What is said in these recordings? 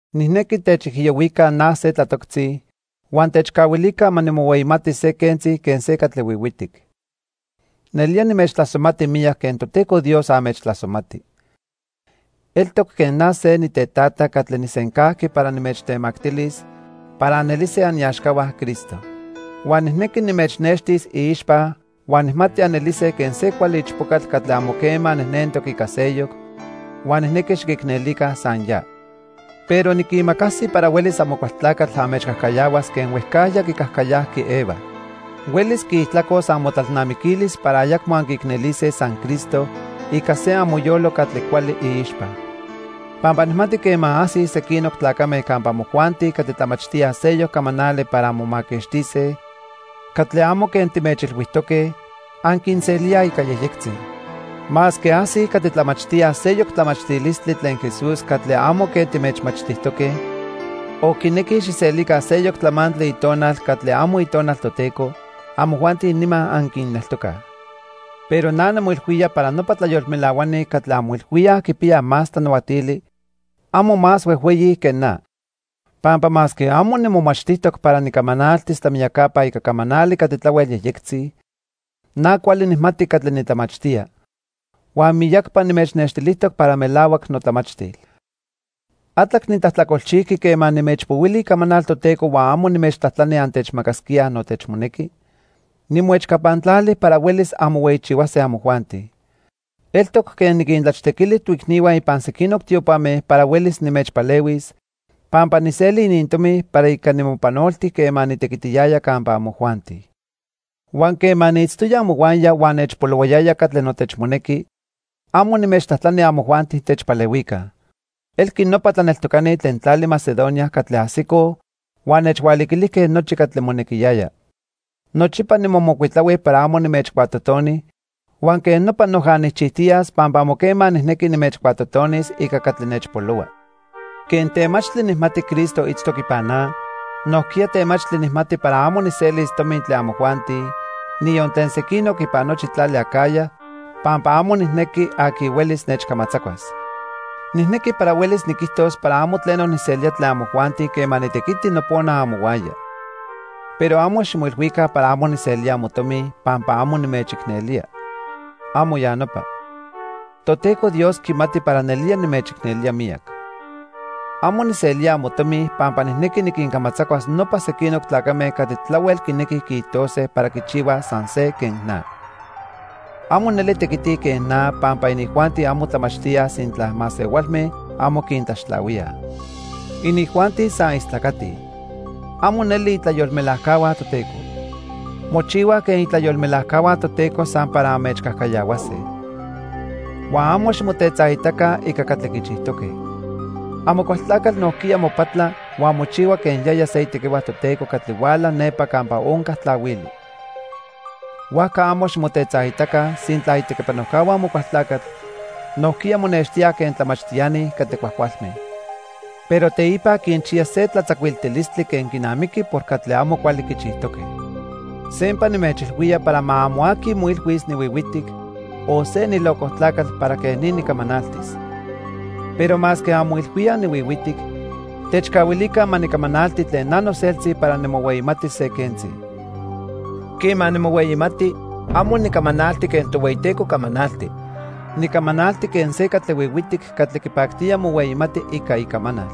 Nijnequi techijiyohuica na se tlatoctzi huan techcahuilica ma nimohueyimatis se quentzi quen se catli huihuitic. Nelía nimechtlasomati miyac quen Toteco Dios anmechtlasomati. Eltoc quen na se nitetata catli nijsencajqui para nimechtemactilis para anelise aniaxcahua Cristo. Huan nijnequi nimechnextis iixpa huan nijmati anelise quen se cuali ichpocatl catli amo quema nejnentoc ica seyoc, huan nijnequi xiquicnelica san ya. Pero niquimacasi para huelis Amocualtlacatl anmechcajcayahuas quen huejcajya quicajcayajqui Eva. Huelis quiijtlacos amotlalnamiquilis para ayacmo anquiicnelise san Cristo ica se amoyolo catli cuali iixpa. Pampa nijmati quema ajsij sequinoc tlacame campa amojuanti catli tlamachtíaj seyoc camanali para anmomaquixtise catli amo quen timechilhuijtoque, anquinselíaj ica yejyectzi. Masque ajsij catli tlamachtíaj seyoc tlamachtilistli tlen Jesús catli amo quen timechmachtijtoque, o quinequij xijselica seyoc tlamantli itonal catli amo Itonal Toteco, amojuanti nima anquinneltocaj. Pero na nimoilhuía para nopa tlayolmelahuani catli anmoilhuíaj quipiyaj más tlanahuatili, amo más huejhueyi que na. Pampa masque amo nimomachtijtoc para nicamanaltis tlamiyacapa ica camanali catli tlahuel yejyectzi, na cuali nijmati catli nitlamachtía, huan miyacpa nimechnextilijtoc para melahuac notlamachtil. ¿Atlac nitlajtlacolchijqui quema nimechpohuili icamanal Toteco huan amo nimechtlajtlani antechmacasquíaj notechmonequi? Nimoechcapantlali para huelis anmohueyichihuase amojuanti. Eltoc quen "niquintlachtequili" toicnihua ipan sequinoc tiopame para huelis nimechpalehuis, pampa nijseli inintomi para ica nimopanolti quema nitequitiyaya campa amojuanti. Huan quema niitztoya amohuaya huan nechpolohuayaya catli notechmonequi, amo nimechtlajtlani amojuanti techpalehuica. Elqui nopa tlaneltocani tlen tlali Macedonia catli ajsicoj huan nechhualiquilijque nochi catli monequiyaya. Nochipa nimomocuitlahui para amo nimechcuatotoni huan quej nopa noja nijchijtiyas pampa amo quema nijnequi nimechcuatotonis ica catli nechpolohua. Quen temachtli nijmati Cristo itztoc ipan na, nojquiya temachtli nijmati para amo nijselis tomi tlen amojuanti, niyon tlen sequinoc ipan nochi tlali Acaya, pampa amo nijnequi aqui huelis nechcamatzacuas. Nijnequi para huelis niquijtos para amo tleno nijselía tlen amojuanti quema nitequiti nopona amohuaya. Pero amo ximoilhuica para amo nijselía amotomi pampa amo nimechicnelía. ¡Amo ya nopa! Toteco Dios quimati para nelía nimechicnelía miyac. Amo nijselía amotomi pampa nijnequi niquincamatzacuas nopa sequinoc tlacame catli tlahuel quinequij quiijtose para quichihuaj san se quen na. Amo neli tequitij quen na pampa inijuanti amo tlamachtíaj sintla masehualme amo quintlaxtlahuíaj. Inijuanti san istlacatij. Amo neli itlayolmelajcahua Toteco. Mochihuaj quen itlayolmelajcahua Toteco san para anmechcajcayahuase. Huan amo ximotetzaitaca ica catli quichijtoque. Amocualtlacatl nojquiya mopatla huan mochihua quen yaya se itequihua Toteco catli huala nepa campa onca tlahuili. Huajca amo ximotetzaitaca sintla itequipanojcahua Amocualtlacatl nojquiya monextíaj quen tlamachtiani catli cuajcualme. Pero teipa quinchiya se tlatzacuiltilistli quen quinamiqui por catli amo cuali quichijtoque. Sempa nimechilhuía para ma amo aqui moilhuis nihuihuitic o se nilocojtlacatl para quej ni nicamanaltis. Pero masque anmoilhuíaj nihuihuitic, techcahuilica ma nicamanalti tlen na noseltzi para nimohueyimatis se quentzi. Quema nimohueyimati, amo nicamanalti quen Tohueyiteco camanalti. Nicamanalti quen se catli huihuitic catli quipactía mohueyimati ica icamanal.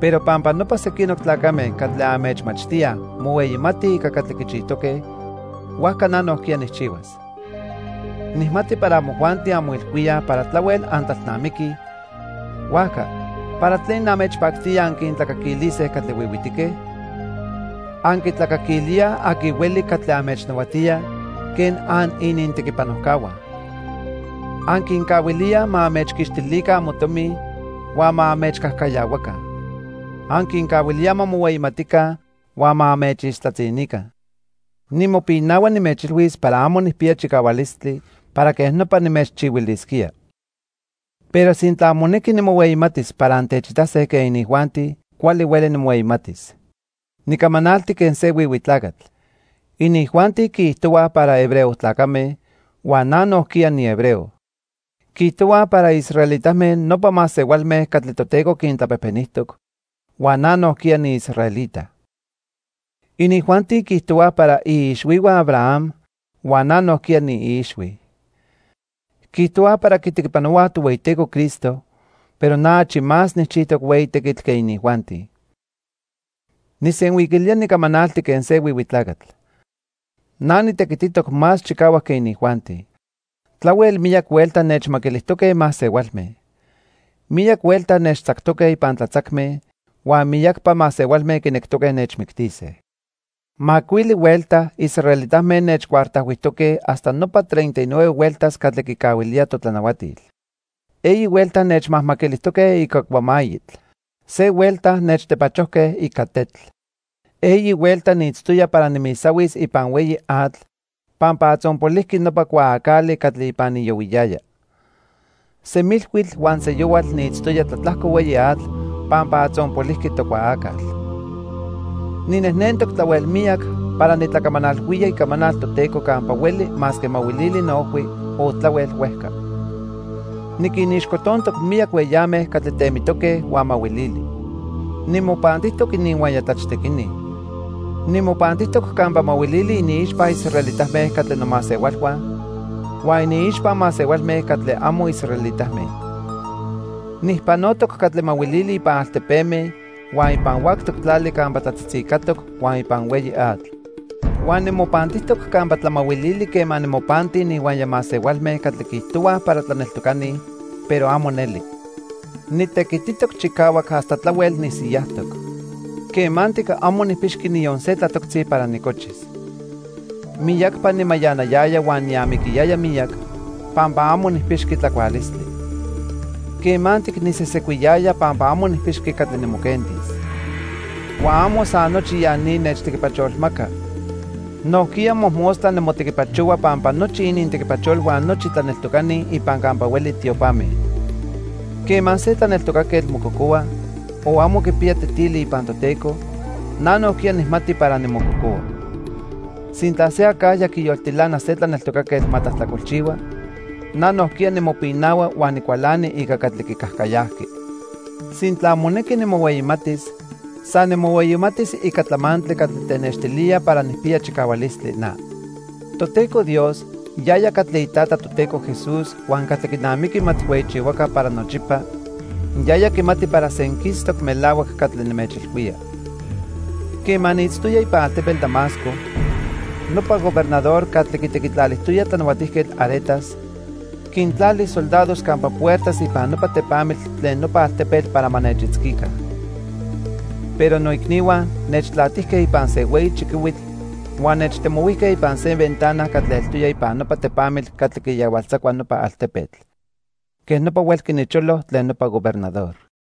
Pero pampa nopa sequinoc tlacame catli anmechmachtíaj mohueyimatij ica catli quichijtoque, huajca na nojquiya nijchihuas. Nijmati para amojuanti anmoilhuíaj para tlahuel antlalnamiquij, huajca ¿para tlen anmechpactía anquintlacaquilise catli huihuitique? Anquitlacaquilíaj aqui hueli catli anmechnahuatía quen aninintequipanojcahua. Anquincahuilíaj ma anmechquixtilica amotomi huan ma anmechcajcayahuaca. Anquincahuilíaj ma mohueyimatica huan ma anmechixtlatzinica. Nimopinahua nimechilhuis para amo nijpiya chicahualistli para quej nopa nimechchihuilisquía. Pero sintla monequi nimohueyimatis para antechitase quen inijuanti, cuali hueli nimohueyimatis. (Nicamanalti quen se huihui tlacatl.) Inijuanti quiijtohuaj para hebreo tlacame, huan na nojquiya nihebreo. Quiijtohuaj para israelitame, nopa masehualme catli Toteco quintlapejpenijtoc, huan na nojquiya niisraelita. Inijuanti quiijtohuaj para iixhuihua Abraham, huan na nojquiya niiixhui. Quiijtohuaj para quitequipanohuaj Tohueyiteco Cristo, pero na achi más nijchijtoc hueyi tequitl que inijuanti. (Nijsenhuiquilía nicamanalti quen se huihui tlacatl.) Na nitequititoc más chicahuac que inijuanti. Tlahuel miyac huelta nechmaquilijtoque masehualme. Miyac huelta nechtzactoque ipan tlatzacme, huan miyacpa masehualme quinectoque nechmictise. Macuili huelta israelitame nechcuartajhuijtoque hasta nopa treinta y nueve hueltas catli quicahuilía totlanahuatil. Eyi huelta nechmajmaquilijtoque ica cuamayitl. Se huelta nechtepachojque ica tetl. Eyi huelta niitztoya para nimisahuis ipan hueyi atl pampa atzonpolijqui nopa cuaacali catli ipan niyohuiyaya. Semilhuitl huan seyohual niitztoya tlatlajco hueyi atl pampa atzonpolijqui tocuaacal. Ninejnentoc tlahuel miyac para nitlacamanalhuía icamanal Toteco campa hueli masque mahuilili noojhui o tlahuel huejca. Niquinixcotontoc miyac hueyame catli temitoque huan mahuilili. Nimopantijtoc ininhuaya tlachtequini. Nimopantijtoc campa mahuilili iniixpa israelitame catli nomasehualhua huan iniixpa masehualme catli amo israelitame. Nijpanotoc catli mahuilili ipan altepeme, huan ipan huactoc tlali campa tlatzitzicatoc huan ipan hueyi atl. Huan nimopantijtoc campa tlamahuilili quema nimopanti ininhuaya masehualme catli quiijtohuaj para tlaneltocani, pero amo neli. Nitequititoc chicahuac hasta tlahuel nisiyajtoc. Quemantic amo nijpixqui niyon se tlatoctzi para nicochis. Miyacpa nimayanayaya huan niamiquiyaya miyac pampa amo nijpixqui tlacualistli. Quemantic nisesecuiyaya pampa amo nijpixqui catli nimoquentis. Huan amo san nochi ya ni nechtequipacholmaca, nojquiya mojmostla nimotequipachohua pampa nochi inintequipacholhua nochi tlaneltocani ipan campa hueli tiopame. Quema se tlaneltocaquetl mococohua o amo quipiya tetili ipan Toteco, na nojquiya nijmati para nimococohua. Sintla se acajya quiyoltilana se tlaneltocaquetl ma tlajtlacolchihua, na nojquiya nimopinahua huan nicualani ica catli quicajcayajqui. Sintla monequi nimohueyimatis, san nimohueyimatis ica tlamantli catli tenextilía para nijpiya chicahualistli na. Toteco Dios, yaya catli iTata Toteco Jesús huan catli quinamiqui ma tijhueyichihuaca para nochipa, yaya quimati para senquistoc melahuac catli nimechilhuía. Quema niitztoya ipan altepetl Damasco, nopa gobernador catli quitequitlalijtoya Tlanahuatijquetl Aretas, quintlali soldados campa puertas ipan nopa tepamitl tlen nopa altepetl para ma nechitzquica. Pero noicnihua nechtlatijque ipan se hueyi chiquihuitl huan nechtemohuijque ipan se ventana catli eltoya ipan nopa tepamitl catli quiyahualtzacua nopa altepetl. Quej nopa huelqui nicholo tlen nopa gobernador.